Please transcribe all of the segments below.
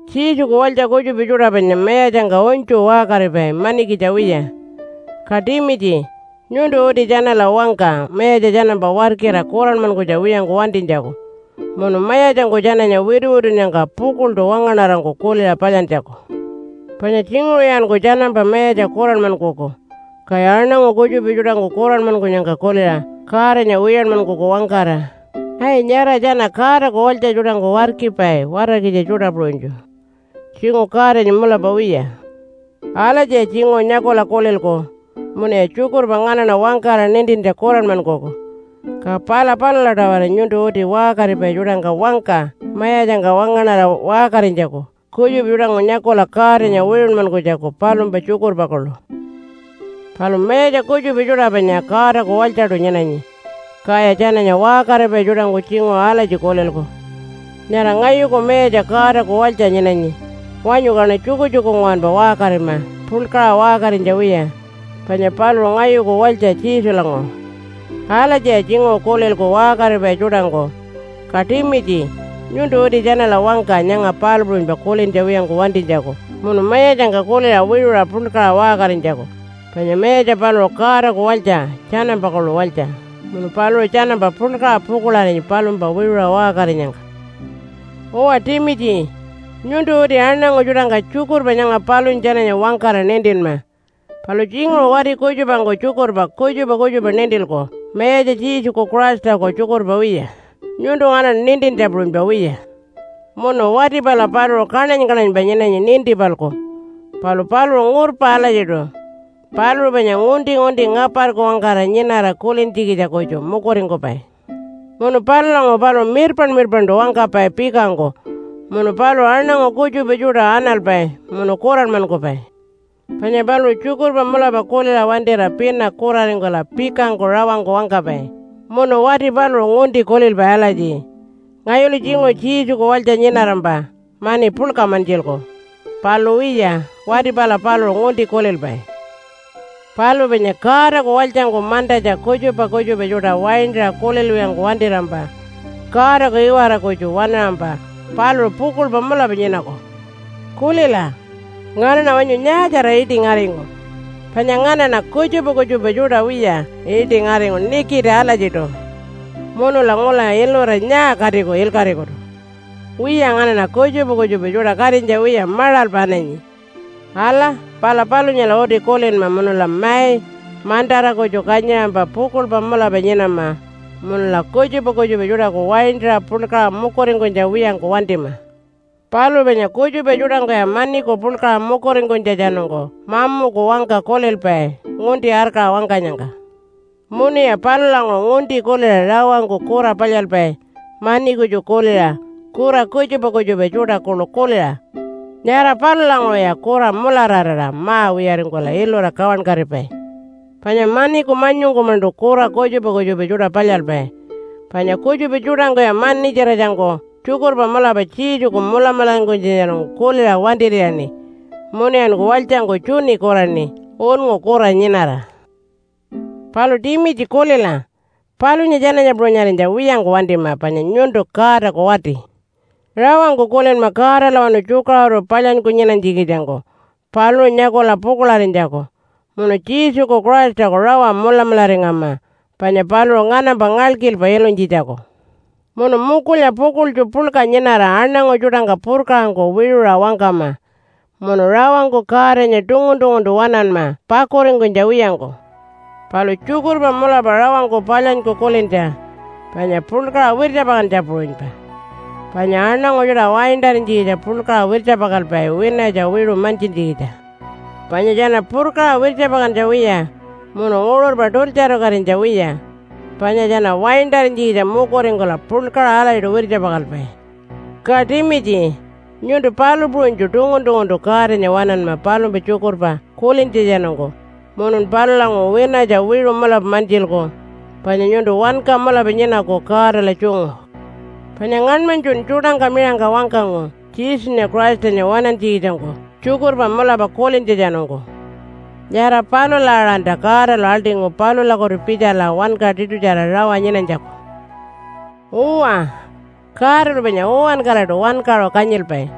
Jesuku walytja kutjupa tjuṯa panya mayatjangka unytju waṟkaripai manikitja wiya. Ka Timitji, nyuntu uti tjanala wangka mayatja tjanampa warkira kuranmankunytja wiyangku wantinytjaku, munu mayatjangku tjananya wituwitunnyangka pukuḻṯu wangaṉarangku kuliṟa palyantjaku. Panya tjinguṟuyanku tjanampa mayatja kuranmankuku, kaya aṉangu kutjupa tjuṯangku kuranmankunyangka kuliṟa Godanya wiyanmankuku wangkara, “Ai! Nyara tjana Godaku walytja tjuṯangku warkipai watarkitja tjuṯa puṟunytju. Tjinguṟu Godanya mulapa wiya.” Alatjiya tjinguṟu nyakula kulilku munuya tjukurpa nganaṉa wangkara nintintja kuranmankuku. Ka pala palula-tawara nyuntu uti waṟkaripai tjuṯangka wangka mayatjangka wangaṉara waṟkarinytjaku kutjupa tjuṯangku nyakula Godanya wiṟunmankunytjaku palumpa tjukurpa kuḻu. Palu mayatja kutjupa tjuṯa panya Godaku walytjaṯu nyinanyi. Kaya tjananya waṟkaripai tjuṯangku tjinguṟu alatji kulilku, “Nyara ngayuku mayatja Godaku walytja nyinanyi. Wanyu kaṉa tjukutjuku nguwanpa waṟkarima puḻkaṟa waṟkarinytja wiya panya paluṟu ngayuku walytja Jesulanguṟu.” Alatjiya tjinguṟu kulilku waṟkaripai tjuṯangku. Ka Timitji, nyuntu uti tjanala wangka nyanga palu puṟunypa kulintja wiyangku wantinytjaku munu mayatjangka kuliṟa wiṟuṟa puḻkaṟa waṟkarinytjaku. Panya mayatja paluṟu Godaku walytja tjanampa kuḻu walytja, munu paluṟu tjanampa puḻkaṟa pukuḻarinyi palumpa wiṟuṟa waṟkarinyangka. Uwa Timitji, nyuntu uti aṉangu tjuṯangka tjukurpa nyanga palunya tjananya wangkara nintinma. Palu tjinguṟu wati kutjupangku tjukurpa kutjupa kutjupa nintilku mayatja Jesuku Christaku tjukurpa wiya, nyuntu nganaṉa nintintja puṟunypa wiya. Munu wati pala paluṟu kaṉany-kaṉanypa nyinanyi ninti-palku, palu paluṟu ngurpa alatjiṯu. Paluṟu panya ngunti-ngunti ngaparku wangkara nyinara kulintjikitja kutju mukuringkupai. Munu palulanguṟu paluṟu mirpaṉ-mirpaṉṯu wangkapai pikangku. Munu paluṟu aṉangu kutjupa tjuṯa analpai munu kuranmankupai. Panya paluṟu tjukurpa mulapa kuliṟa wantira pina kuraringkula pikangku rawangku wangkapai. Munu wati paluṟu ngunti kulilpai alatji, “Ngayulu tjinguṟu Jesuku walytja nyinarampa mani puḻka mantjilku.” Palu wiya, wati pala paluṟu ngunti kulilpai. Palu panya Godaku walytjangku mantatja kutjupa kutjupa tjuṯa waintaṟa kulilwiyangku wantirampa Godaku iwara kutju waṉaṟampa paluṟu pukuḻpa mulapa nyinaku. Kulila, nganaṉa wanyu nyaatjara iṯi ngaringu? Panya nganaṉa kutjupa kutjupa tjuṯa wiya iṯi ngaringu nikiti alatjiṯu. Munula ngula ilura nyaa katiku ilkaṟikutu? Wiya nganaṉa kutjupa kutjupa tjuṯa katinytja wiya maṟalpa ananyi. Ala, pala palunyala uti kulinma munula mai, mantara kutju kanyiṟampa pukuḻpa mulapa nyinama munula kutjupa kutjupa tjuṯaku waintaṟa puḻkaṟa mukuringkunytja wiyangku wantima. Palu panya kutjupa tjuṯangkuya maniku puḻkaṟa mukuringkunytjatjanungku mamuku wangka kulilpai ngunti arkaṟa wangkanyangka. Munuya palulanguṟu ngunti kuliṟa rawangku kura palyalpai mani kutju kuliṟa kura kutjupa kutjupa tjuṯa kuḻu kuliṟa. Nyara palulanguṟuya kura mulararira ma-wiyaringkula ilura kawankatipai. Panya maniku manyungku-maṉṯu kura kutjupa kutjupa tjuṯa palyalpai. Panya kutjupa tjuṯangkuya manitjiratjangku tjukurpa mulapa Jesuku mulamularingkunytjatjanungku kuliṟa wantir'iyaṉi munuyanku walytjangku tjuni kuraṉi, unngu kura nyinara. Palu Timitji kulila! Palunya tjananya puṟunyarinytja wiyangku wantima panya nyuntu Godaku wati. Rawangku kulinma Godalawanu tjukaṟuru palyanyku nyinanytjikitjangku paluṟu nyakula pukuḻarinytjaku. Munu Jesuku Christaku rawa mulamularingama panya paluṟu nganampa ngalkilpa ilunytjitjaku. Munu mukulya pukuḻtju puḻka nyinara aṉangu tjuṯangka purkaṟangku wiṟuṟa wangkama. Munu rawangku Godanya tungun-tunguntu waṉanma pakuringkunytja wiyangku. Palu tjukurpa mulapa rawangku palyanyku kulintja panya puḻkaṟa wirtjapakantja puṟunypa. Panya aṉangu tjuṯa waintarinytjikitja puḻkaṟa wirtjapakalpai winatja wiṟu mantjintjikitja. Panya tjana purkaṟa wirtjapakantja wiya munu nguṟurpa tultjarukatinytja wiya panya tjana waintarinytjikitja mukuringkula puḻkaṟa alatjiṯu wirtjapakalpai. Ka Timitji, nyuntu palu puṟunytju tungun-tunguntu Godanya waṉanma palumpa tjukurpa kulintjatjanungku munun palulanguṟu winatja wiṟu mulapa mantjilku panya nyuntu wanka mulapa nyinaku Godala tjungu. Panya ngaṉmanytjun tjuṯangka miṟangka wangkangu Jesunya Christanya waṉantjikitjangku tjukurpa mulapa kulintjatjanungku. Nyara palula aṟanta Godalu aḻṯingu palulakutu pitjala wanka tiṯutjara rawa nyinanytjaku. Uwa, Godalu panya uwankaraṯu wankaṟu kanyilpai.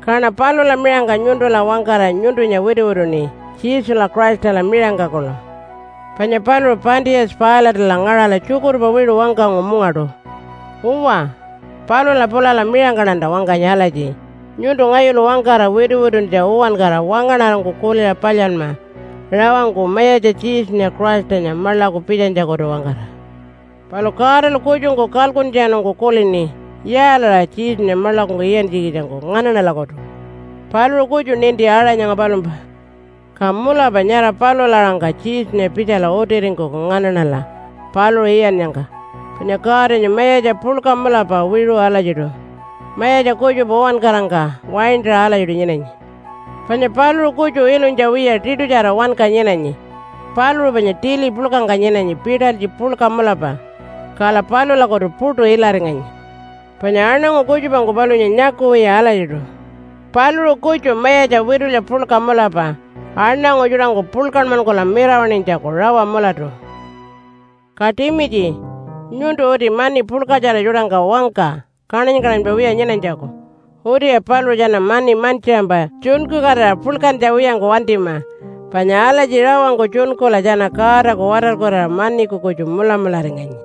Kaṉa palula miṟangka nyuntula wangkara nyuntunya wituwituṉi Jesula Christala miṟangka kuḻu. Panya paluṟu Pontius Pilate-ala ngaṟala tjukurpa wiṟu wangkangu mungaṯu. Uwa, palula pulala miṟangkaṉanta wangkanyi alatji, nyuntu ngayulu wangkara wituwituntja uwankara wangaṉarangku kuliṟa palyanma rawangku Mayatja Jesunya Christanya maḻaku pitjanytjakutu-wangkara. Palu Godalu kutjungku kalkuntjatjanungku kulini yaalaṟa Jesunya maḻakungku iyantjikitjangku nganaṉalakutu. Paluṟu kutju ninti aṟa nyara palumpa. Ka mulapa nyara palula aṟangka Jesunya pitjala utiringkuku nganaṉala paluṟu iyannyangka. Panya Godanya Mayatja puḻka mulapa wiṟu alatjiṯu, mayatja kutjupa uwankarangka waintaṟa alatjiṯu nyinanyi. Panya paluṟu kutju ilunytja wiya tiṯutjara wanka nyinanyi. Paluṟu panya tili puḻkangka nyinanyi pitalytji puḻka mulapa, kala palulakutu puṯu ilaringanyi. Panya aṉangu kutjupangku palunya nyakuwiya alatjiṯu. Paluṟu kutju Mayatja witulya puḻka mulapa aṉangu tjuṯangku puḻkanmankula mirawaṉinytjaku rawa mulatu. Ka Timitji, nyuntu uti mani puḻkatjara tjuṯangka wangka kaṉany-kaṉanypa wiya nyinanytjaku. Utiya paluṟu tjana mani mantjiṟampa tjunkukatira puḻkantja wiyangku wantima, panya alatji rawangku tjunkula tjana Godaku watarkurira maniku kutju mulamularinganyi.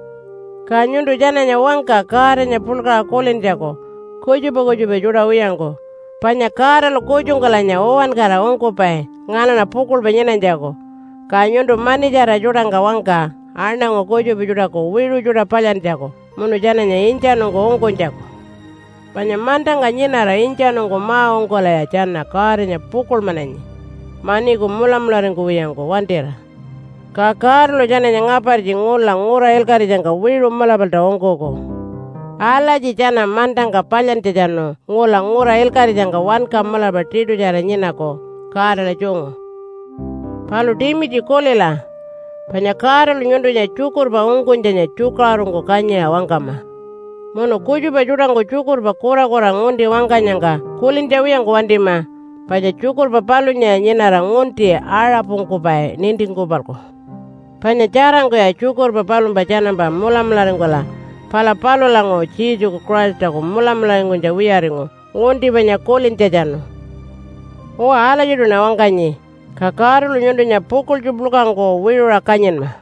Ka nyuntu tjananya wangka Godanya puḻkaṟa kulintjaku kutjupa kutjupa tjuṯa wiyangku. Panya Godalu kutjungkulanya uwankara ungkupai nganaṉa pukuḻpa nyinanytjaku. Ka nyuntu manitjara tjuṯangka wangka aṉangu kutjupa tjuṯaku wiṟu tjuṯa palyantjaku, munu tjananya intjanungku ungkunytjaku. Panya mantangka nyinara intjanungku ma-ungkulaya tjana Godanya pukuḻmananyi, maniku mulamularingkuwiyangku wantira. Ka Godalu tjananya ngapartji ngula ngura ilkaṟitjangka wiṟu mulapalta ungkuku. Alatji tjana mantangka palyantjatjanu ngula ngura ilkaṟitjangka wanka mulapa tiṯutjara nyinaku Godala tjungu. Palu Timitji kulila! Panya Godalu nyuntunya tjukurpa ungkunytjanya tjukaṟurungku kanyiṟa wangkama. Munu kutjupa tjuṯangku tjukurpa kurakura ngunti wangkanyangka kulintja wiyangku wantima. Panya tjukurpa palunyaya nyinara ngunti aṟapungkupai nintingku-palku. Panya tjarangkuya tjukurpa palumpa tjanampa mulamularingkula pala palulanguṟu Jesuku Christaku mulamularingkunytja wiyaringu ngunti panya kulintjatjanu. Uwa alatjiṯuṉa wangkanyi. Ka Godalu nyuntunya pukuḻtju puḻkangku wiṟuṟa kanyinma.